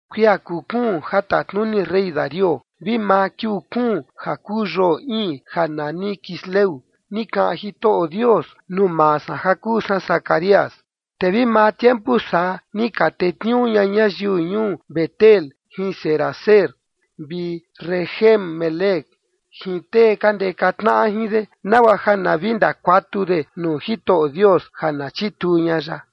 Kuia kuu kuun ja tatnuni rey Darío, vi maa kiuu kuun ja kuu yoo iin ja nani Quisleu, ni kaꞌan Jitoꞌo Dios nuu maa san ja kuu san Zacarías. Te vi maa tiempu saa ni ka tetniuu ña ñayiu ñuu Betel jin Sarezer vi Regem-melec jin tee ka ndeka tnaꞌa jin de, nagua ja na vi ndakuatu de nuu Jitoꞌo Dios ja na chituu ña ya,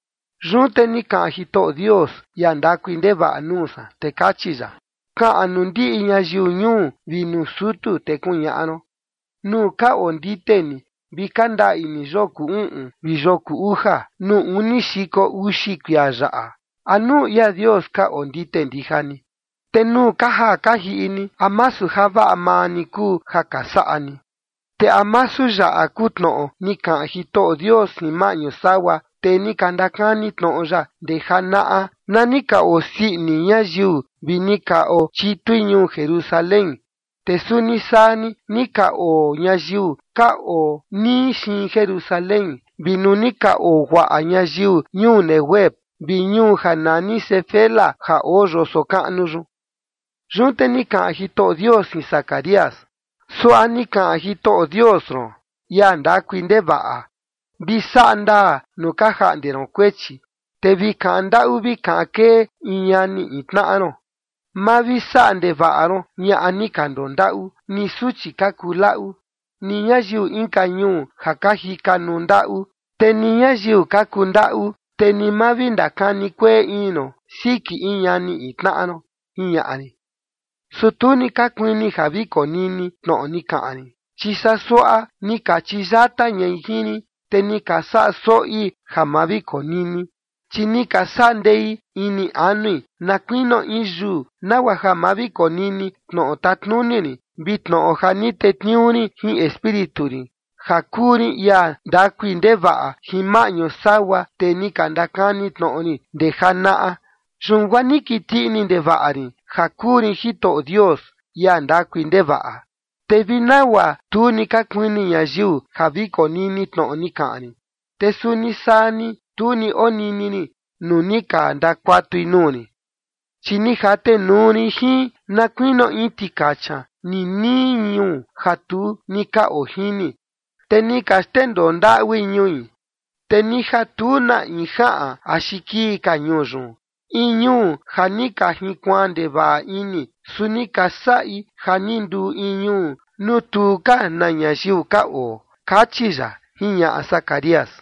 Yun te ni kaꞌan Jitoꞌo Dios, ia ndakui ndevaꞌa, nuu san, te kachi ya: “Kaꞌan nuu ndiꞌi ñayiu ñuu vi nuu sutu, te kuñaꞌa ron: Nuu ka ondite ni vi ka ndaꞌi ni yoo kuu uꞌun vi yoo kuu uja, nuu uni xiko uxi kuia yaꞌa, ¿a nuu ia Dios ka ondite ndija ni? Te nuu ka jaa ka jiꞌi ni, ¿a masu javaꞌa maa ni kuu ja ka saꞌa ni?” ¿Te a masu yaꞌa kuu tnoꞌo ni kaꞌan Jitoꞌo Dios jin maꞌñu sagua tee ni ka ndakani tnoꞌo ya ndee janaꞌa, na ni ka osii ini ñayiu vi ni ka ochitui ñuu Jerusalén, te suni saa ni, ni ka oo ñayiu ka oo nii xiin Jerusalén vi nuu ni ka oo guaꞌa ñayiu ñuu Neguev vi ñuu ja nani Sefela ja oo yoso kaꞌnu yun? Yun te ni kaꞌan Jitoꞌo Dios jin Zacarías: “Suaꞌa ni kaꞌan Jitoꞌo Dios ron, ia ndakui ndevaꞌa: Vi saꞌa ndaa nuu ka jaꞌnde ron kuechi, te vi kaꞌan ndaꞌu vi kaꞌan kee in ñani in tnaꞌa ron. Ma vi saꞌa ndevaꞌa ron ñaꞌa ni ka ndondaꞌu, ni suchi ka kuu laꞌu, ni ñayiu inka ñuu ja ka jikanuu ndaꞌu, te ni ñayiu ka kuu ndaꞌu, te ni ma vi ndakani kueꞌe ini ron siki in ñani in tnaꞌa ron, jiñaꞌa rin. Su tu ni ka kuini ja vi konini tnoꞌo ni kaꞌan rin, chi saa suaꞌa ni ka chiyata ñai jin rin, te ni ka saꞌa soꞌi ja ma vi konini. Chi ni ka saꞌa ndei ini anui na kuinio in yuu, nagua ja ma vi konini tnoꞌo tatnuni rin, vi tnoꞌo ja ni tetniuu rin jin Espíritu rin, ja kuu rin ia ndakui ndevaꞌa, jin maꞌñu sagua tee ni ka ndakani tnoꞌo rin ndee janaꞌa. ’Yun guaa ni kiti ini ndevaꞌa rin ja kuu rin Jitoꞌo Dios, ia ndakui ndevaꞌa. Te vi nagua tu ni ka kuini ñayiu ja vi konini tnoꞌo ni kaꞌan rin, te suni saa ni, tu ni onini rin nuu ni ka ndakuatui nuu rin. Chi ni jatenuu rin jin na kuinio in tikacha ninii ñuu ja tu ni ka ojini, te ni ka xndendoo ndaꞌui ñui, te ni ja tu na in jaꞌan axi kii ka ñuu yun, in ñuu ja ni ka jinkuaan ndevaꞌa ini, su ni ka saꞌi ja ni nduu in ñuu nuu tu ka na ñayiu ka oo”, kachi ya, jiñaꞌa Zacarías.